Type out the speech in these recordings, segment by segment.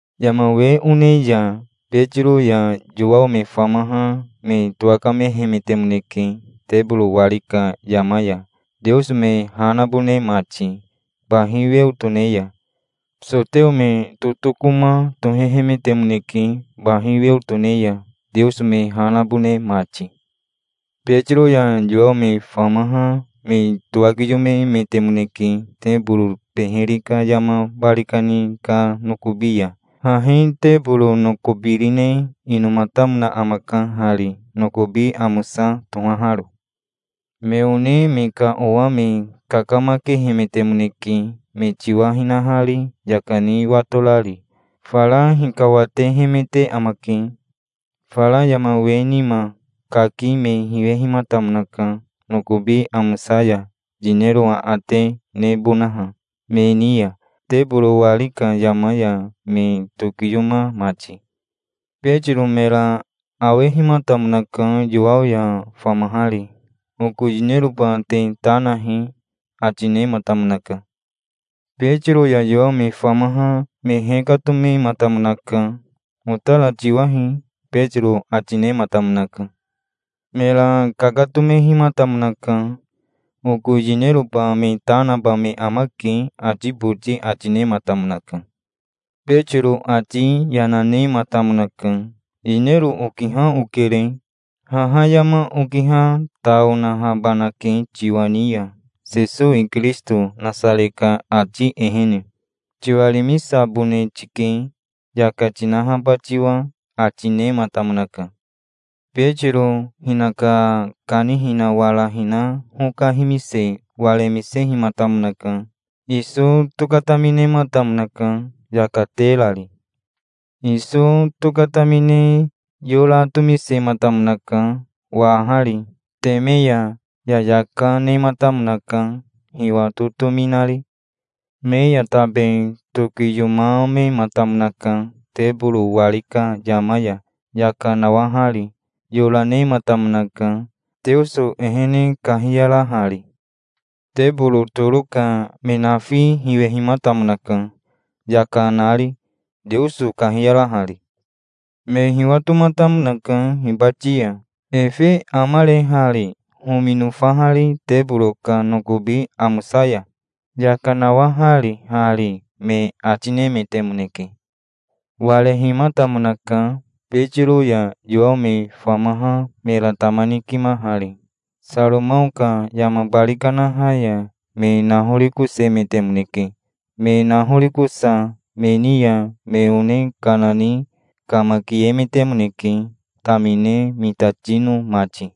Yama we one ya Betiro ya Yowao me famaha me towakamehemetemoneke, teboro wari ka yama ya, Teoso me ha nabone mati bahi weo tone ya. Soteo me totokoma tohehemetemoneke, bahi weo tone ya, Teoso me ha nabone mati. Betiro ya Yowao me famaha me towakiyomemetemoneke teboro beheri ka yama bari kani ka nokobi ya. Hahi teboro nokobirine inomatamona amaka hari, nokobi amosa tohaharo. Me one me ka owa me kakamakehemetemoneke me tiwa hinahari yaka ni watorari. Fara hikawatehemete amake. Fara yama we nima kaki me hinehimatamonaka nokobi amosa ya yinero aate nebonaha, me ni ya, teboro wari ka yama ya me tokiyoma mati. Betiro mera awehimatamonaka Yowao ya famahari. "Oko yineroba te ta nahi", ati nematamonaka. Betiro ya Yowao me famaha me hekatomematamonaka. "Otara tiwahi", Betiro ati nematamonaka. Mera kakatomehimatamonaka. "Oko yineroba me ta naba me amake", ati boti ati nematamonaka. Betiro ati yana nematamonaka. "Yinero okiha okere. Haha yama okiha ta onahabanake tiwa ni ya. Sesowi Kirisito Nasare ka ati ehene tiwarimisabone tike, yaka tinahaba tiwa", ati nematamonaka. Betiro hinaka kanihina wara hina hoka himise waremisehimatamonaka. Iso tokataminematamonaka, yaka terari. Iso tokatamine yora tomisematamonaka wahari. Teme ya yayaka nematamonaka, hiwa totomi nari. Me ya tabe tokiyomamematamonaka teboro wari ka yama ya yaka nawahari. Yora nematamonaka, Teoso ehene kahiyarahari. Teboro toro ka me nafi hiwehimatamonaka, yaka nari, Teoso kahiyarahari. Me hiwatomatamonaka hibati ya. "Efe amare hari homi nofahari teboro ka nokobi amosa ya? Yaka nawahari hari me", ati nemetemoneke. Warehimatamonaka, Betiro ya Yowao me famaha mera tama nikimahari. Saromao ka yama bari karaha ya me nahorikosemetemoneke. Me nahorikosa me ni ya me one kana ni kamakiemetemoneke, tamine mitatino mati.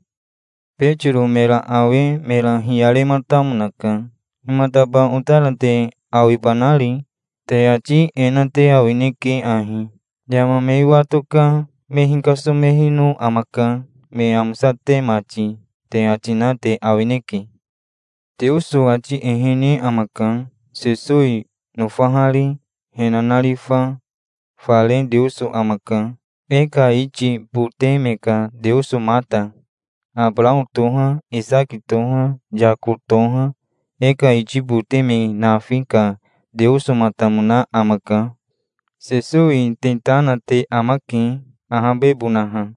Betiro mera awe mera hiyarematamonaka. "Himataba otara te awibanari? Te ati e na te awineke ahi: 'Yama me wato ka me hikasomehino amaka, me amosate mati', te ati na te awineke. Teoso ati ehene amaka, Sesowi nofahari, he nanarifa. Fare Teoso amaka, e ka iti bote me ka Teosomata. Abarao toha, Isaki toha, Yako toha, e ka iti bote me nafi ka Teosomatamona amaka. Sesowi te ta na te amake, ahabebonaha.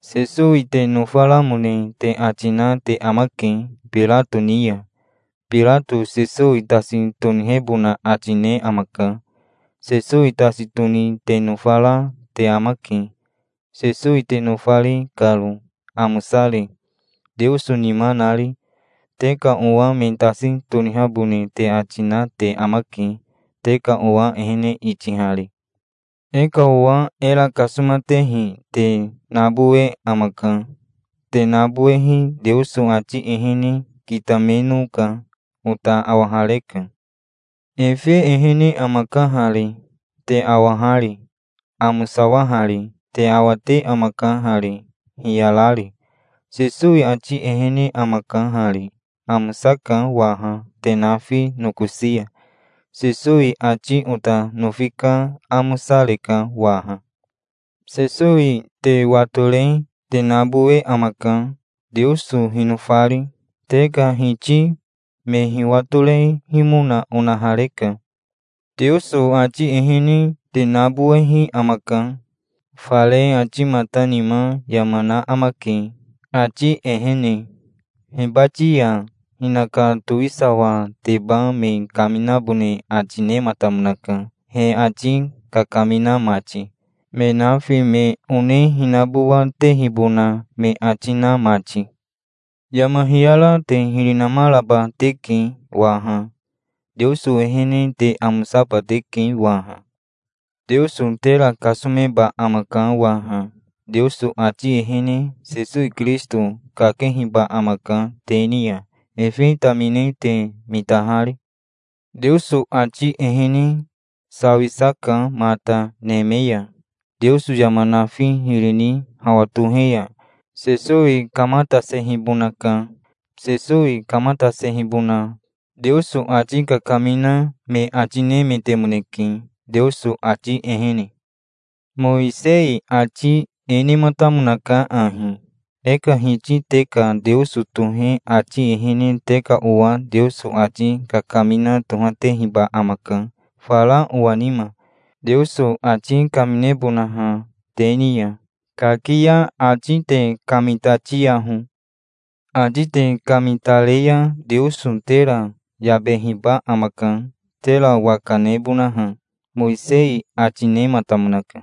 Sesowi te nofaramone te ati na te amake, Birato ni ya. Birato Sesowi tasi tonihebona ati ne amaka. Sesowi tasi toni te nofara te amake, Sesowi te nofari karo, amosari, Teoso nima nari. Te ka owa me tasi tonihabone te ati na te amake, te ka owa ehene itihari. E ka owa era kasomatehi te nabowe amaka. Te nabowehi Teoso ati ehene kitamenoka. Ota awahareka. Efe ehene amaka hari, te awahari, amosawahari. Te awate amaka hari, hiyarari. Sesowi ati ehene amaka hari. Amosaka waha te nafi nokosi ya. Sesowi ati ota nofi ka amosareka waha". "Sesowi te watore te nabowe amaka, Teoso hinofari. Te ka hiti me hiwatorehimona onahareka. Teoso ati ehene te nabowehi amaka. Fare atimatamona nima yama na amake, ati ehene. Hibati ya hinaka towisawateba me kaminabone ati nematamonaka, he ati kakamina mati, me nafi, me one hinabowatehibona me ati na mati. Yama hiyara te hiri namaraba teke waha. Teoso ehene te amosaba teke waha. Teoso tera kasomeba amaka waha. Teoso ati ehene Sesowi Kirisito kakehiba amaka te ni ya, efe tamine te mitahari. Teoso ati ehene sawisa ka mata neme ya. Teoso yama nafi hiri ni hawa tohe ya Sesowi kamatasehibonaka. Sesowi kamatasehibona Teoso ati kakamina me ati nemetemoneke, Teoso ati ehene. Mowisei ati e nematamonaka ahi: 'E ka Hiti te ka Teoso tohe ati ehene te ka owa Teoso ati kakamina tohatehiba amaka fara owa nima, Teoso ati kaminebonaha te ni ya. Kaki ya ati te kamitatiyaho. Ati te kamitare ya Teoso tera yabehiba amaka, tera waka nebonaha', Mowisei ati nematamonaka.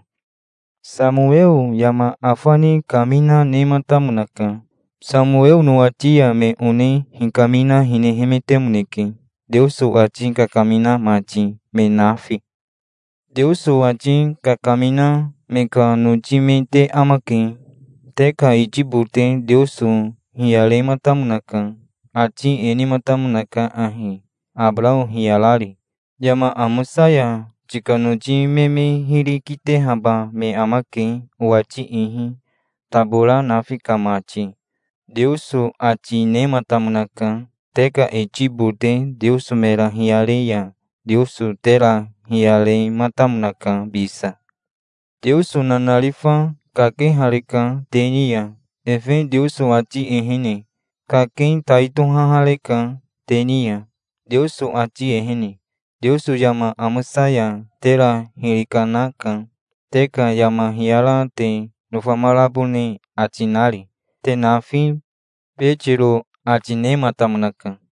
Samoweo yama afani kamina, nematamonaka. Samoweo nowati ya me one hikamina, hinehemetemoneke, Teoso ati kakamina mati, me nafi. Teoso ati kakamina me ka noti me te amake. Te ka iti bote Teoso hiyarematamonaka. Ati e nematamonaka ahi Abarao hiyarari: 'Yama amosa ya tika noti me me hiri kitehaba me amake owati ihi, tabora nafi ka mati', Teoso ati nematamonaka. Te ka iti bote Teoso mera hiyare ya Teoso tera hiyarematamonaka bisa. Teoso nanarifa kakehareka te ni ya, efe Teoso ati ehene. Kaki tai tohahareka te ni ya, Teoso ati ehene. Teoso yama amosa ya tera hiri kanaka, te ka yama hiyara te nofamarabone ati nari, te nafi", Betiro ati nematamonaka.